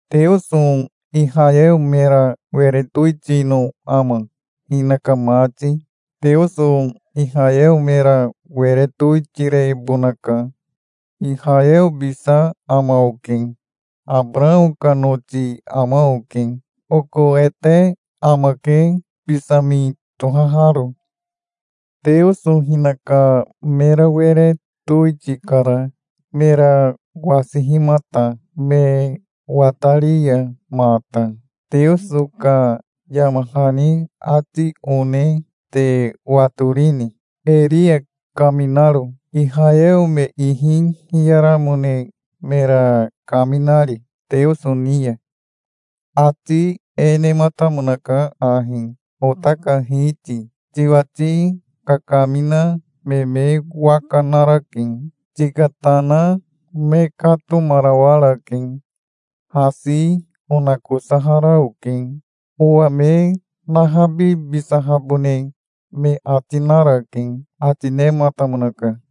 Teoso Ihayeo mera were towitino ama, hinaka mati? Teoso Ihayeo mera were towitirebonaka. Ihayeobisa ama oke. Abarao ka noti ama oke. Oko ete amake, Bisami tohaharo. Teoso hinaka mera were towitikara, mera wasihimata, me watari ya mata. Teoso ka yama hani ati one te watorini, Eria kaminaro, Ihayeo me ihi hiyaramone mera kaminari Teoso ni ya? Ati e nematamonaka ahi: "Ota ka Hiti, tiwati kakamina me me waka narake. Tika tana me katomarawarake. Hasi onakosahara oke. Owa me nahabibisahabone me ati narake", ati nematamonaka.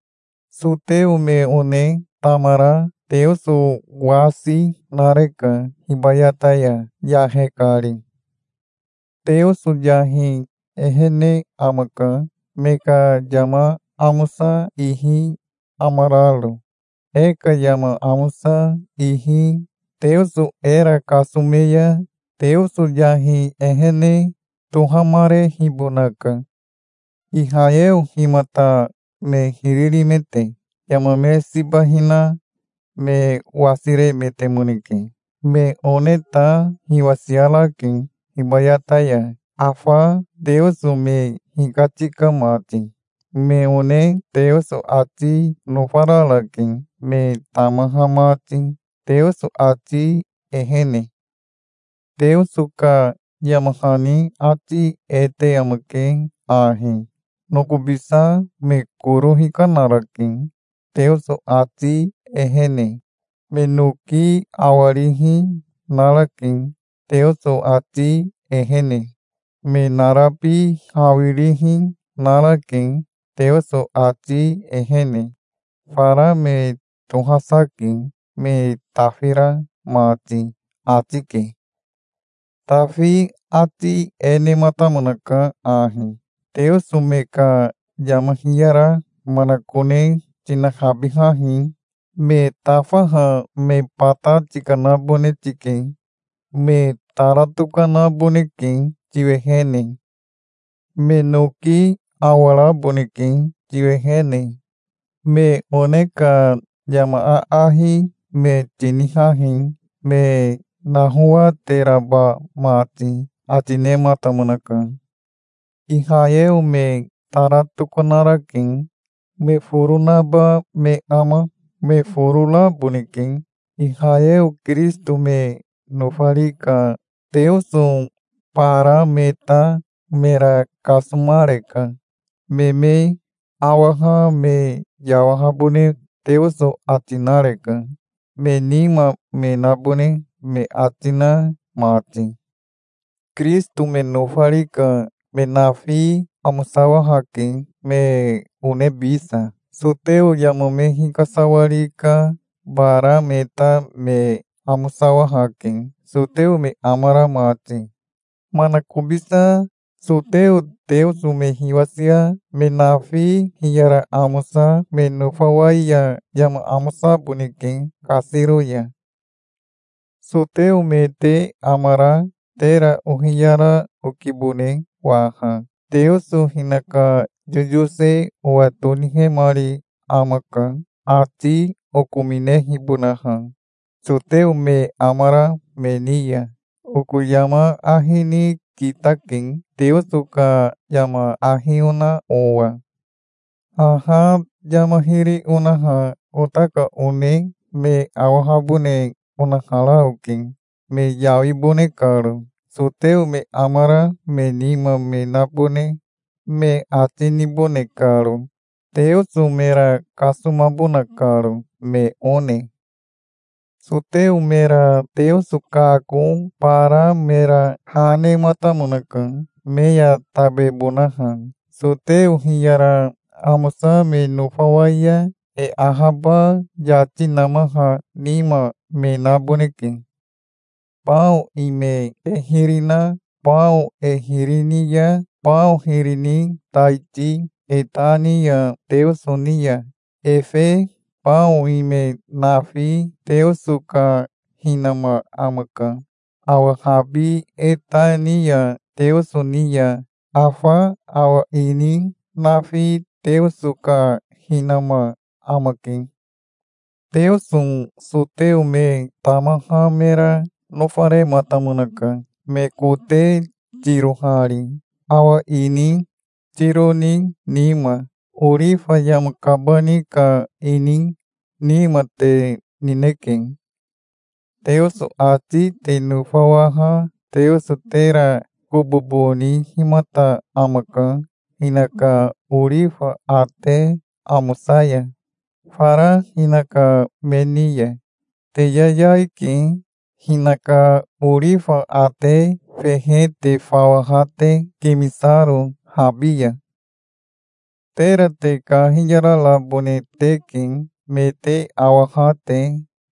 Soteo me one tamara Teoso wasi nareka hibayata ya, yahe kari. Teoso yahi ehene amaka, me ka yama amosa ihi amararo. E ka yama amosa ihi Teoso era kasome ya, Teoso yahi ehene tohamarehibonaka. Ihayeo himata me hiri rimete? Yama me siba hina me wasiremetemoneke. Me one ta hiwasiarake hibayata ya, afa Teoso me hikatika mati. Me one Teoso ati nofararake, me tamaha mati, Teoso ati ehene. Teoso ka yama hani ati e te amake ahi: "Nokobisa me koro hikanarake Teoso ati ehene. Me noki awarihi narake Teoso ati ehene. Me narabi hawirihi narake, Teoso ati ehene. Fara me tohasa ke, me tafira mati", ati ke. Tafi ati e nematamonaka ahi: "Teoso me ka yama hiyara manakone tinahabihahi. Me tafaha me bata tikanabone tike. Me tara tokanaboneke tiwehene. Me noki awaraboneke tiwehene. Me one ka yama aahi me tinihahi me nahowateraba mati", ati nematamonaka. Ihayeo me tara tokanarake. Me foro naba me ama? Me foro raboneke. Ihayeo Kirisito me nofari ka Teoso bara me ta mera kasomareka. Me me awaha me yawahabone Teoso ati nareka, me nima me nabone me ati na mati. Kirisito me nofari ka me nafi amosawahake, me onebisa. Soteo yama me hikasawari ka bara me ta me amosawahake, soteo me amara mati. Manakobisa soteo Teoso me hiwasia me nafi hiyara amosa me nofawai ya yama amosaboneke kasiro ya. Soteo me te amara tera ohiyara okibone waha. Teoso hinaka yoyose owa tonihemari amaka, ati okominehibonaha soteo me amara me ni ya. Oko yama ahi ni kitake, Teoso ka yama ahi ona owa. Haha yama hiri onaha ota ka one me awahabone onahara oke, me yawibone karo, soteo me amara me nima me nabone me ati nibone karo, Teoso mera kasomabona karo, me one. Soteo mera Teoso kako bara mera ha nematamonaka, me ya tabebonaha. Soteo hiyara amosa me nofawai ya, e ahaba yati namaha nima me naboneke. Bao ime e hiri na bao e hiri ni ya bao hiri ni taiti e ta ni ya Teoso ni ya, efe bao ime nafi Teoso ka hinama amaka. Awa habi e ta ni ya Teoso ni ya, afa awa ini nafi Teoso ka hinama amake. Teoso soteo me tamaha mera nofarematamonaka, me kote tirohari, awa ini tiro ni nima. Orifa yama kabani ka ini nima te nineke. Teoso ati te nofawaha Teoso tera kobobo nihimata amaka hinaka orifa ate amosa ya, fara hinaka me ni ya. Te yayai ke, hinaka orifa ate fehe te fawaha te, kimisaro habi ya. Tera te kahiyararabone teke, me te awaha te,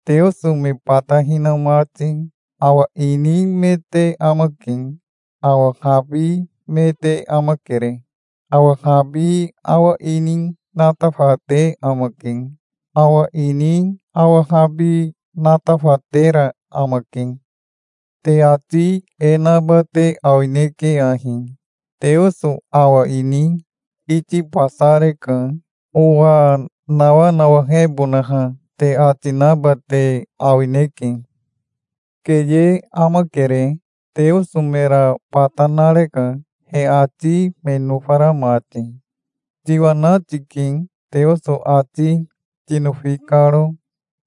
Teoso me bata hina mati. Awa ini me te amake. Awa habi me te amakere. Awa habi awa ini natafate amake. Awa ini awa habi natafatera amake. Te ati e naba te awineke ahi: "Teoso awa ini itibasareka, owa nawanawahebonaha", te ati naba te awineke. Keye amakere. Teoso mera bata nareka, he ati me nofara mati. Tiwana tike, Teoso ati tinofi karo.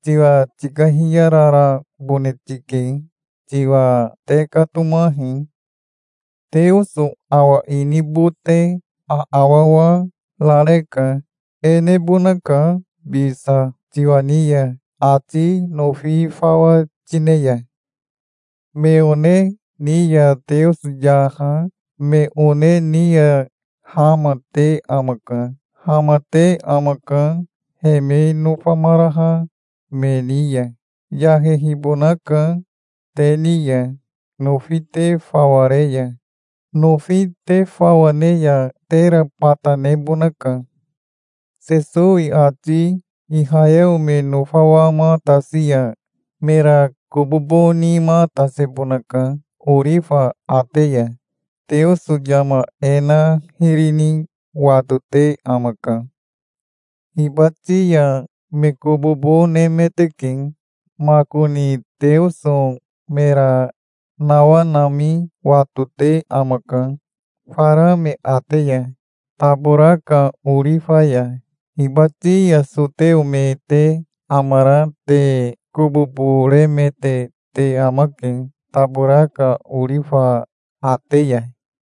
Tiwa tikahiyararabone tike. Tiwa tekatomahi. Teoso awa ini bote aawawa rareka. E nebonaka bisa tiwa ni ya, ati nofi fawa tine ya. Me one ni ya Teoso yaha, me one ni ya hama, te amaka. Hamate amaka, he me nofamaraha me ni ya. Yahehibonaka te ni ya, nofi te fawa re ya. Nofi te fawa ne ya tera bata nebonaka. Sesowi ati Ihayeo me nofawamatasi ya mera kobobo nimatasebonaka orifa ate ya. Teoso yama e na hiri ni watote amaka. Hibati ya me kobobo nemeteke. Makoni Teoso mera nawanami watote amaka, fara me ate ya, tabora ka orifa ya. Hibati ya soteo me te amara te kobobo remete te amake tabora ka orifa ate ya.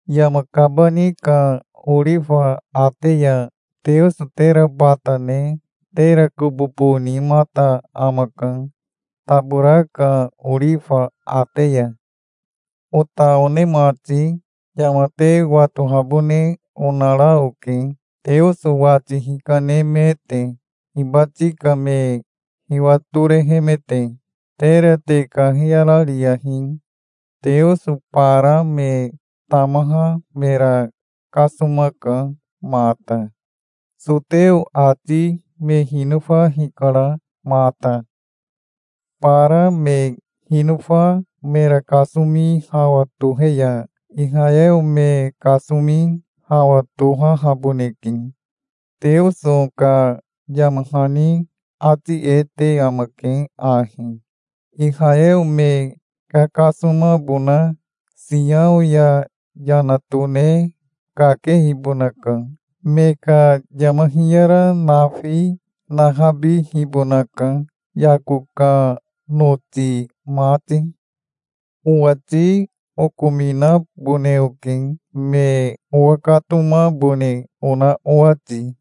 Yama kabani ka orifa ate ya Teoso tera bata ne tera kobobo nimata amaka, tabora ka orifa ate ya. Ota one mati, yama te watohabone onara oke, Teoso wati hikanemete, hibati ka me hiwatorehemete. Tera te kahiyarariyahi. Teoso bara me tamaha mera kasomaka mata. Soteo ati me hinofa hikara mata. Bara me hinofa mera kasomi hawa tohe ya Ihayeo me kasomi hawa tohahaboneke. Teoso ka yama hani ati e te amake ahi: "Ihayeo me kakasomabona Siao ya yana tone kakehibonaka. Me ka yama hiyara nafi nahabihibonaka, Yako ka noti mati. Owati okominabone oke, me owakatomabone ona owati.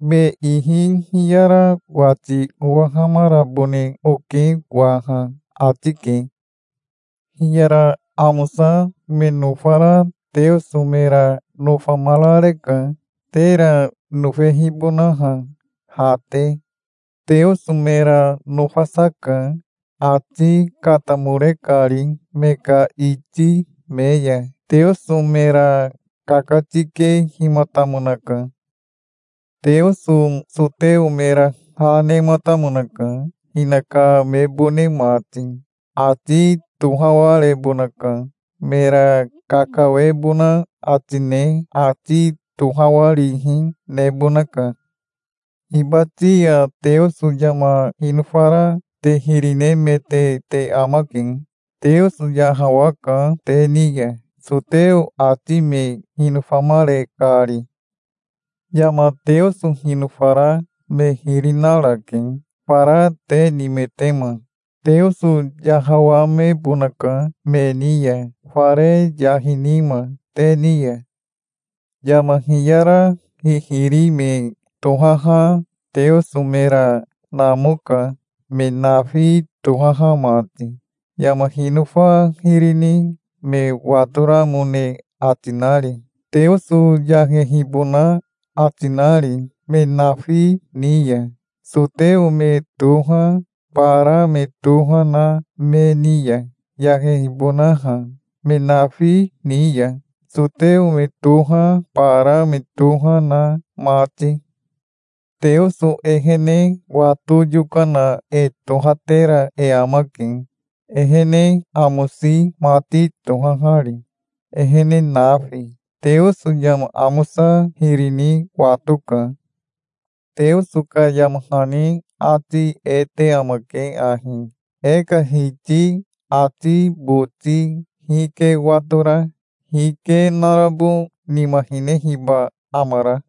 Me ihi hiyara wati owahamarabone oke waha", ati ke. Hiyara amosa me nofara Teoso mera nofamarareka, tera nofehibonaha, ha te. Teoso mera nofasa ka, ati katamore kari me ka iti me ya. Teoso mera kakatikehimatamonaka. Teoso soteo mera ha nematamonaka, hinaka mebone mati. Ati tohawarebonaka. Mera kakawebona ati ne ati tohawarihi nebonaka. Hibati ya Teoso yama hinofara te hiri nemete te amake. Teoso yahawaka te ni ya, soteo ati me hinofamare kari. Yama Teoso hinofara me hiri narake, fara te nimetema. Teoso yahawamebonaka me ni ya, fare yahi nima te ni ya. Yama hiyara hihiri me tohaha Teoso mera namoka, me nafi tohaha mati, yama hinofa hiri ni me watoramone ati nari, Teoso yahehibona ati nari me nafi ni ya, soteo me toha, bara me toha na me ni ya, yahehibonaha me nafi ni ya, soteo me toha, bara me toha na mati. Teoso ehene wato yokana e tohatera e amake, ehene amosi mati tohahari, ehene nafi. Teoso yama amosa hiri ni watoka. Teoso ka yama hani ati e te amake ahi: "E ka Hiti ati boti hike watora? Hike narabo nima hinehiba amara?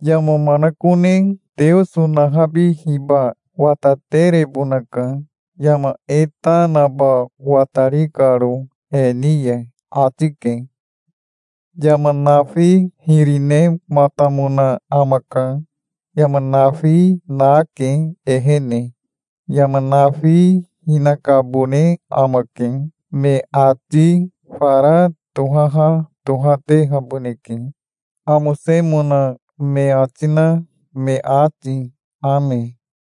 Yama manakone Teoso nahabihiba wataterebonaka, yama e ta naba watari karo he ni ya", ati ke. Yama nafi hiri nematamona amaka. Yama nafi nake ehene. Yama nafi hinakabone amake. Me ati fara tohaha tohatehaboneke, amosemona me ati na me ati. Ame.